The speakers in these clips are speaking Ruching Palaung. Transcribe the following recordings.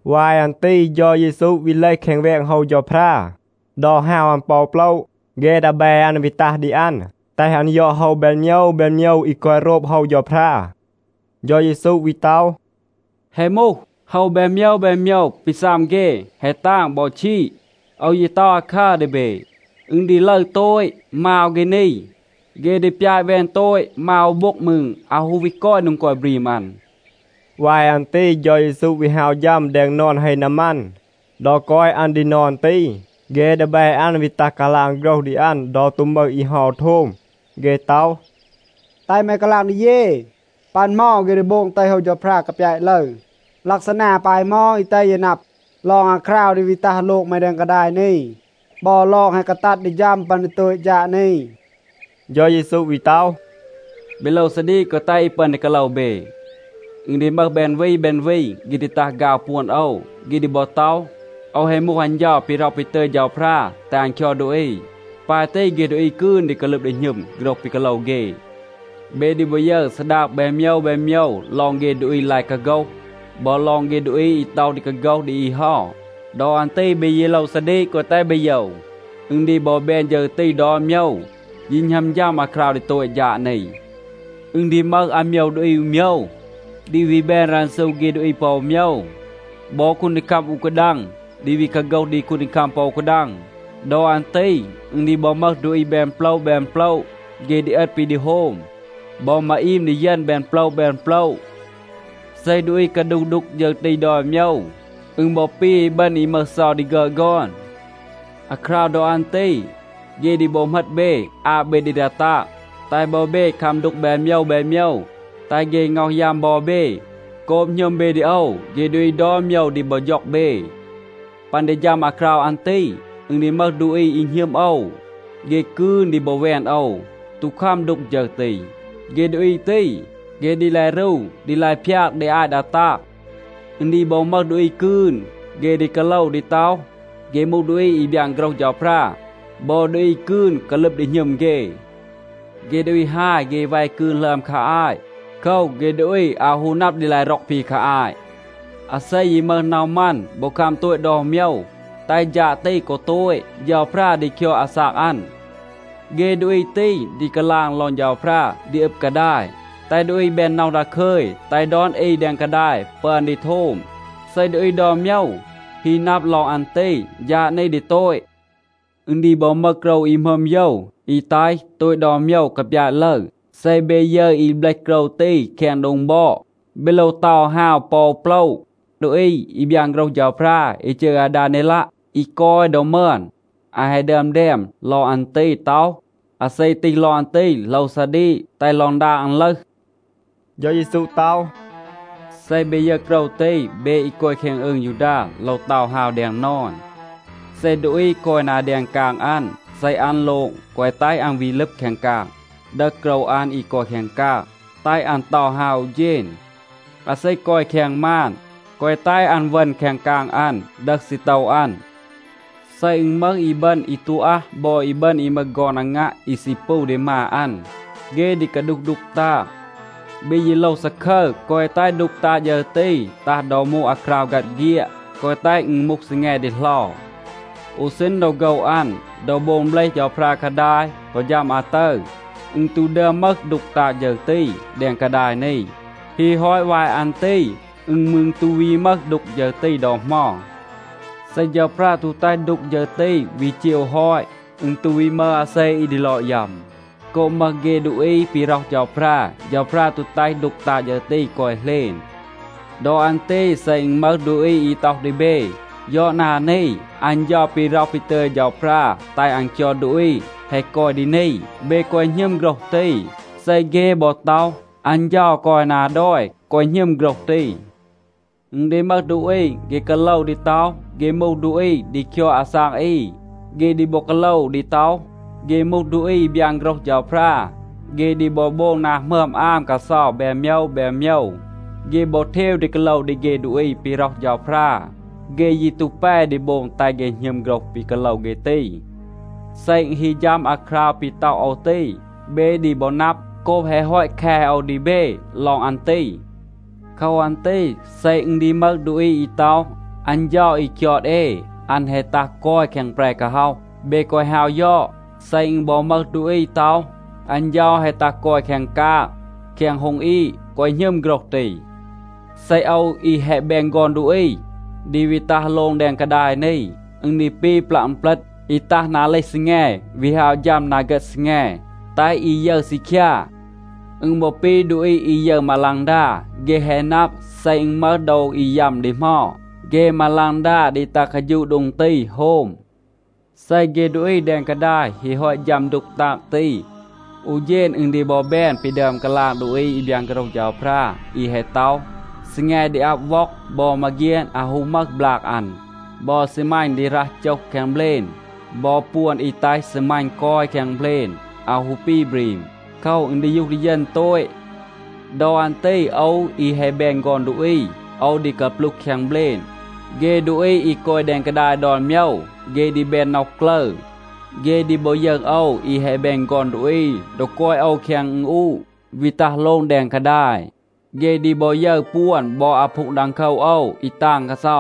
วาย อัน ตี เฌา เยซู วี เลห แคง แวง โฮว เฌาพรา. ดอ ฮาว อัน ปอ อู โปละ, เฆ ดีแบ อัน วี ตัห ดี อัน, แตห อัน ยอด โฮว แบน โมยว แบน โมยว อี กอย โรบ โฮว เฌาพรา. เฌา เยซู วี ต็อห, “แฮะ มูห, โฮว แบน โมยว แบน โมยว ปี ซัม เฆ, แฮะ ตาง บอ ชีด. โอว ยี ต็อห อาคัร ดี เบ, อึณ ดี ลึร โตต. มาว เฆ นี, เฆ ดี ปยาต แวน โตต. มาว อู โบ็ง มืร อาว ฮู วี กอย โดง กอย บรีม อัน.” วาย อัน ตี เฌา เยซู วี ฮาว ฌัม แดง นอน เฮ นามัน. ดอ กอย อัน ดี นอน ตี, เฆ ดีแบ อัน วี ตัห กาลาง โฆรห ดี อัน ดอ ตู มึห อี เฮา โทม. เฆ ต็อห, “แตห แม กาลาง ดี เย, ปัน เหมา เฆ ดี โบง แตห โฮว เฌาพรา กาปยาต ลึร? ลักซานา ปาย เหมา อี แตห เย นับ ลอง อาคราว ดี วี ตัห โลง แม แดง กาดาย นี บอ ลอง แฮะ กาตัด ดี ฌัม ปัน ดี โตต ฌาด นี?” เฌา เยซู วี ต็อห, “เบ โลว ซาดีก, แกวะ แตห อี ปึอน ดี กาโลว เบ. อึณ ดี มึห แบน วี แบน วี, เฆ ดี ตัห ฆาว ปวน โอว. เฆ ดี บอ ต็อห, ‘โอว แฮะ มูห อัน เฌา ปี ร็อห ปี ตึย เฌาพรา แตห อัน คยอด ดูอี.’ ปาย ตี เฆ ดูอี กืน ดี กาลึบ ดี หณึม โฆรห ปี กาโลว เฆ. เบ ดี บอ ยึร ซาดาง แบน โมยว แบน โมยว ลอง เฆ ดูอี ลาย กาโฆห, บอ ลอง เฆ ดูอี อี ต็อห ดี กาโฆห ดี อี เฮา. ดอ อัน ตี เบ ยี โลว ซาดีก, แกวะ แตห เบ โยว. อึณ ดี บอ แบน ฌึร ตี ดอน โมยว, ยี หณัม ฌัม อาคราว ดี โตต ฌาด นี. อึณ ดี มึห อาโมยว ดูอี อู โมยว, ดี วี แบน รันซู เฆ ดูอี ปอ อู โมยว. บอ คูนดีคัม อู กาดัง ดี วี กาโฆห ดี คูนดีคัม ปอ อู กาดัง. ดอ อัน ตี อึณ ดี บอ มึห ดูอี แบน โปละ แบน โปละ, เฆ ดี เอต ปี ดี โฮม. บอ มาอีม ดีเยณ แบน โปละ แบน โปละ. เซ ดูอี กาดูห ดูก ฌึร ตี ดอน โมยว, อึณ บอ ปี อีบึณ อี มึห เซา ดี ฆึอด ฆอน. อาคราว ดอ อัน ตี เฆ ดี บอ เหมต เบ, อาบ เบ ดี ดา ตาง, แตห บอ เบ คัม ดูก แบน โมยว แบน โมยว, แตห เฆ ง็อห ยัม บอ เบ. โกบ หณึม เบ ดี โอว, เฆ ดูอี ดอน โมยว ดี บอ ฌ็อง เบ. ปัน ดี ฌัม อาคราว อัน ตี, อึณ ดี มึห ดูอี อี หณึม โอว, เฆ กืน ดี บอ แวน โอว, ตู คัม ดูก ฌึร ตี. เฆ ดูอี ตี, เฆ ดี ลาย รู, ดี ลาย พยาก ดี อาต ดา ตาง. อึณ ดี บอ มึห ดูอี กืน, เฆ ดี กาโลว ดี ต็อห, เฆ มูห ดูอี อี บยาน โฆรห เฌาพรา. บอ ดูอี กืน กาลึบ ดี หณึม เฆ. เฆ ดูอี ฮาย เฆ แว กืน หลึอม คา อาต. โคว, เฆ ดูอี อาว ฮู นับ ดี ลาย ร็อก ปี คา อาต. อาเซ ยี มึห น็อห มัน บอ คัม โตต ดอน โมยว, แตห ฌาด ตี กอ โตต, เฌาพรา ดี คยอด อาซาก อัน. เฆ ดูอี ตี ดี กาลาง ลอง เฌาพรา ดี อึบ กาดาย, แตห ดูอี แบน น็อห ดาคึย, แตห ดอน อี แดง กาดาย ปึอน ดี โทม. เซ ดูอี ดอน โมยว ฮี นับ ลอง อัน ตี, ฌาด นี ดี โตต. อึณ ดี บอ มึห โกรว อี หมึอม โยว, อี แตห โตต ดอน โมยว กาปยาต ลึร. เซ เบ ยึร อี เบลห โกรว ตี แคง โดง บอด, เบ โลว เตา ฮาว ปอ โปละ.” ดูอี อี บยาน โฆรห เฌาพรา อี จืร อาดาเนลัะ, อี กอย ดอ มึอน, อัน แฮะ ดึอม แดม ลอง อัน ตี ต็อห, “อาเซ ตีห ลอง อัน ตี โลว ซาดีก, แตห ลอง ดาง อัน ลึห.” เฌา เยซู ต็อห, “เซ เบ ยึร โกรว ตี, เบ อี กอย แคง อืง ยูดา โลว เตา ฮาว แดง นอน. เซ ดูอี กอย นา แดง กาง อัน,a เซ อัน โลง, แกวะ แตห อัน วี ลึบ แคง กาง, ดึห โกรว อัน อี กอย แคง กาง. แตห อัน เตา ฮาว อู เฌณ. อาเซ กอย แคง มาน, แกวะ แตห อัน เวณ แคง กาง อัน, ดึห ซีโตว อัน. เซ อึณ มึห อีบึณ อี ตู อัห บอ อีบึณ อี มึห ฆอน อางัะ อี ซี ปู ดี มา อัน, เฆ ดี กาดูห ดูก ตาง. เบ ยี โลว ซาคึร, แกวะ แตห ดูก ตาง ฌึร ตี ตัห ดอ มูห อาคราว ฆัด เฆียด, แกวะ แตห อึณ มูห ซีแง ดีเหลา. อู ซีณ ดอ โฆว อัน, ดอ โบง เบลห เฌาพรา กาดาย กอ ฌัม อาตึร, อึณ ตู ดึอม มึห ดูก ตาง ฌึร ตี แดง กาดาย นี. ฮี ฮอต วาย อัน ตี อึณ มืร ตู วี มึห ดูก ฌึร ตี ดอ เหมา. เซ เฌาพรา ตู แตห ดูก ฌึร ตี วี เจว ฮอต, อึณ ตู วี มึห อาเซ อี ดี ลอด ยัม. โกบ มึห เฆ ดูอี ปี ร็อห เฌาพรา, เฌาพรา ตู แตห ดูก ตาง ตี กอย เหลณ. ดอ อัน ตี เซ อึณ มึห ดูอี อี ต็อห ดี เบ, ‘ยอด นา นี, อัน เฌา ปี ร็อห ปี ตึย เฌาพรา แตห อัน คยอด ดูอี แฮะ กอย ดี นี,’ เบ แกวะ หณึม โฆรห ตี. เซ เฆ บอ ต็อห, ‘อัน เฌา กอย นา ดอย,’ แกวะ หณึม โฆรห ตี. อึณ ดี มึห ดูอี, เฆ กาโลว ดี ต็อห, เฆ มูห ดูอี ดี คยอด อาซาก อี. เฆ ดี บอ กาโลว ดี ต็อห, เฆ มูห ดูอี อี บยาน โฆรห เฌาพรา. เฆ ดี บอ โบง นา หมึอม อาม กาเซา แบน โมยว แบน โมยว. เฆ บอ เทว ดี กาโลว ดี เฆ ดูอี ปี ร็อห เฌาพรา. เฆ ยี ตู แป ดี โบง แตห เฆ หณึม โฆรห ปี กาโลว เฆ ตี. เซ อึณ ฮี ฌัม อาคราว ปี ต็อห โอว ตี, เบ ดี บอ นับ, โกบ แฮะ ฮอต แค โอว ดี เบ ลอง อัน ตี. โคว อัน ตี เซ อึณ ดี มึห ดูอี อี ต็อห, ‘อัน เฌา อี คยอด เอ, อัน แฮะ ตัห กอย แคง แปร กาฮ็อห,’ เบ แกวะ ฮาว ยอด. เซ อึณ บอ มึห ดูอี ต็อห, ‘อัน เฌา แฮะ ตัห กอย แคง กาง, แคง โฮง อีด,’ แกวะ หณึม โฆรห ตี. เซ โอว อี แฮะ แบน ฆอน ดูอี ดี วี ตัห โลง แดง กาดาย นี, อึณ ดี ปี ปลัะ อึณเปลต, อี ตัห นา เลห ซีแง, วี ฮาว ฌัม นา เฆต ซีแง, แตห อี ยึร ซีคยา. อึณ บอ ปี ดูอี อี ยึร มาลังดา. เฆ แฮะ นับ, เซ อึณ มึห โดว อี ยัม ดี เหมา, เฆ มาลังดา ดี ตัห กาฌูะ โดง ตี, โฮม. เซ เฆ ดูอี แดง กาดาย ฮี ฮอต ฌัม ดูก ตาง ตี, อู เฌณ อึณ ดี บอ แบน ปี ดึอม กาลาง ดูอี อี บยาน โฆรห เฌาพรา อี แฮะ ต็อห, ‘ซีแง ดี อับ ว็อง. บอ มาเฆียน อาว ฮู มึห บลาง อัน. บอ ซีมัณ ดี รัห โจห แคง เบลณ. บอ ปวน อี แตห ซีมัณ กอย แคง เบลณ อาว ฮู ปี บรีม. โคว, อึณ ดียูห ดี เยณ โตต.’ ดอ อัน ตี โอว อี แฮะ แบน ฆอน ดูอี, โอว ดี กาปลูห แคง เบลณ. เฆ ดูอี อี กอย แดง กาดาย ดอน โมยว, เฆ ดี แบน น็อห กลึร. เฆ ดี บอ ยึร โอว อี แฮะ แบน ฆอน ดูอี, ดอ กอย โอว แคง อึณอูะ, วี ตัห โลง แดง กาดาย. เฆ ดี บอ ยึร ปวน บอ อาพูง ดังโคว โอว อี ตาง กาเซา.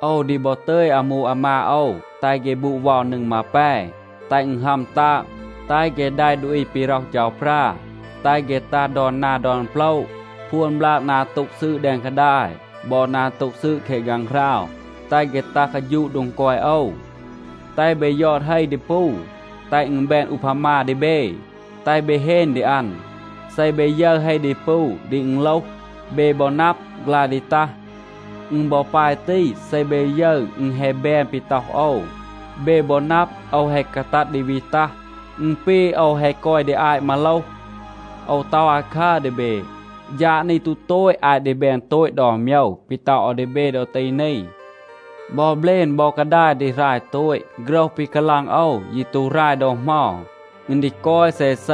โอว ดี บอ ตึย อามู อามาด โอว, แตห เฆ บูด เวา นึง มาแป, แตห อึณ ฮัม ตาง, แตห เฆ แดะ ดูอี ปี ร็อห เฌาพรา, แตห เฆ ตัห ดอน นา ดอน โปละ พวน บลาก นา โต็ง ซืด แดง กาดาย บอ นา โต็ง ซืด แคง ฆางหราว, แตห เฆ ตัห กาฌูะ โดง กอย โอว. แตห เบ ยอด เฮ ดีปู, แตห อึณ แบน อูพามา ดี เบ, แตห เบ เฮน ดี อัน. เซ เบ ยึร เฮ ดีปู ดี อึณโลห, เบ บอ นับ, ฆลาย ดี ตัห. อึณ บอ ปาย ตี. เซ เบ ยึร อึณ แฮะ แบน ปี ต็อห โอว, เบ บอ นับ, โอว แฮะ กาตัด ดี วี ตัห. อึณ ปี, โอว แฮะ กอย ดี อาต มาโลห. โอว ต็อห อาคัร ดี เบ. ฌาด นี ตู โตต อาต ดี แบน โตต ดอน โมยว ปี ต็อห โอว ดี เบ ดอ ตี นี. บอ เบลณ บอ กาดาย ดี หราย โตต. โฆรห ปี กาลาง โอว ยี ตู หราย ดอ เหมา. อึณ ดี กอย เซเซ.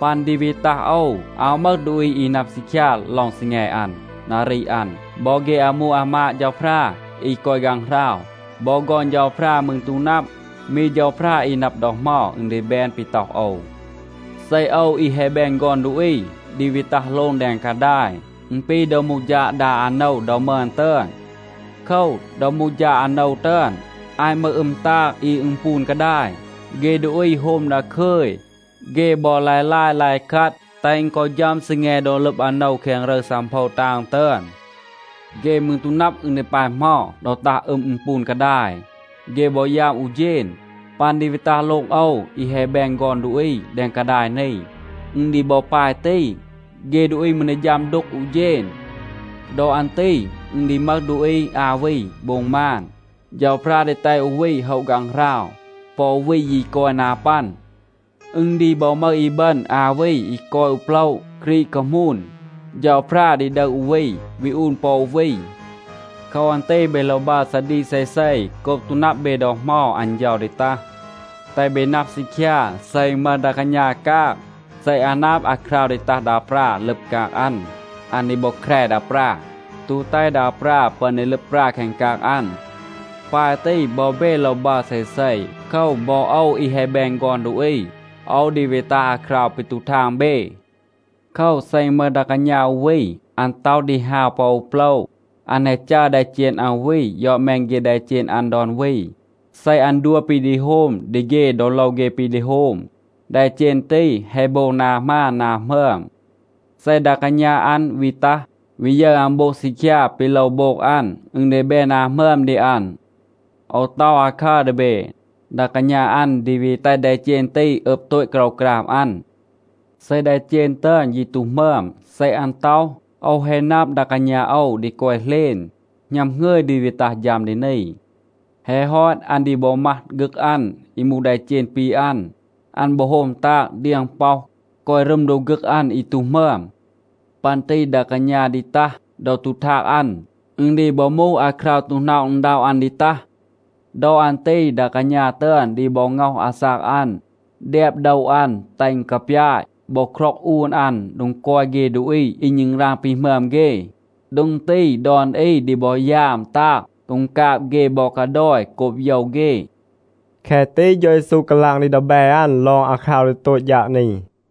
ปัน ดี วี ตัห โอว, อาว มึห ดูอี อี นับ ซีคยา ลอง ซีแง อัน, นารี อัน. บอ เฆ อามู อามาด เฌาพรา อี กอย ฆางหราว, บอ ฆอน เฌาพรา มืร ตู นับ. มี เฌาพรา อี นับ ดอ เหมา อึณ ดี แบน ปี ต็อห โอว. เซ โอว อี แฮะ แบน ฆอน ดูอี ดี วี ตัห โลง แดง กาดาย, อึณ ปี ดอ มูห ฌาด ดา อาโนว ดอ มึอน ตึอน. โคว, ดอ มูห ฌาด อาโนว ตึอน, อาต มึห อึม ตาง อี อึณปูน กาดาย, เฆ ดูอี โฮม ดาคึย. เฆ บอ ลาย ลาย, ลาย คัด, แตห อึณ กอ ฌัม ซีแง ดอ ลึบ อาโนว แคง รึร ซังโพว ตาง ตึอน. เฆ มืร ตู นับ, อึณ ดี ปาย เหมา. ดอ ตัห อึม, อึณปูน กาดาย, เฆ บอ ยัม อู เฌณ. ปัน ดี วี ตัห โลง โอว, อี แฮะ แบน ฆอน ดูอี แดง กาดาย นี, อึณ ดี บอ ปาย ตี. เฆ ดูอี มืร ดี ฌัม ดูก อู เฌณ. ดอ อัน ตี อึณ ดี มึห ดูอี อา วี โบง มาน. เฌาพรา ดี แตห อู วี โฮะ ฆางหราว. ปอ อู วี ยี กอย นา ปัน. อึณ ดี บอ มึห อีบึณ อา วี อี กอย อู โปละ, กรีด คามูน. เฌาพรา ดี ดึห อู วี, วี อูน ปอ อู วี. โคว อัน ตี เบ โลว บัร ซาดีก เซเซ, โกบ ตู นับ เบ ดอ เหมา อัน เฌา ดี ตัห. แตห เบ นับ ซีคยา. เซ อึณ มึห ดา กาณา กาง, เซ อัน นับ อาคราว ดี ตัห ดา ปรา ลึบ กาง อัน, อัน ดี บอ แคร ดา ปรา, ตู แตห ดา ปรา ปึอน ดี ลึบ ปรา แคง กาง อัน. ปาย ตี, บอ เบ โลว บัร เซเซ. โคว, บอ โอว อี แฮะ แบน ฆอน ดูอี, โอว ดี วี ตัห อาคราว ปี ตู ทาง เบ. โคว, เซ อึณ มึห ดา กาณา อู วี, อัน ต็อห ดี ฮาว ปอ อู โปละ, อัน แฮะ จัร แดเจณ อัน อู วี ยอด แมน เฆ แดเจณ อัน ดอน วี, เซ อัน ดัว ปี ดี โฮม ดี เฆ ดอ โลว เฆ ปี ดี โฮม, แดเจณ ตี แฮะ โบง นา หมาน, นา หมึอม. เซ ดา กาณา อัน วี ตัห, วี ยึร อัน โบง ซีคยา ปี โลว โบง อัน, อึณ ดี แบน นา หมึอม ดี อัน. โอว ต็อห อาคัร ดี เบ, ดา กาณา อัน ดี วี แตห แดเจณ ตี อึบ โตต โกรวกราม อัน. เซ แดเจณ ตึอน ยี ตู หมึอม. เซ อัน ต็อห, ‘โอว แฮะ นับ, ดา กาณา โอว ดี กอย เหลณ, หณัม หงึย ดี วี ตัห ฌัม ดี นี,’ แฮะ ฮอต อัน ดี บอ มัห ฆึก อัน อี มูห แดเจณ ปี อัน. อัน บอ โฮม ตาง, เดียง ป็อห, กอย รึม โดบ ฆึก อัน อี ตู หมึอม. ปัน ตี ดา กาณา ดี ตัห ดอ ตู ทาง อัน. อึณ ดี บอ มูห อาคราว ตู หน็อะ อึณด็อะ อัน ดี ตัห. ดอ อัน ตี ดา กาณา ตึอน ดี บอ ง็อห อาซาก อัน, แดบ โดว อัน แตห อึณ กาปยาต บอ คร็อง อูน อัน โดง กอย เฆ ดูอี อี ณึงราง ปีหมึอม เฆ. โดง ตี ดอน อี ดี บอ ยาม ตาง. กูงกาบ เฆ บอ กาดอย โกบ โยว เฆ.” แคะ ตี เฌา เยซู กาลาง ดี ดีแบ อัน ลอง อาคราว ดี โตต ฌาด นี.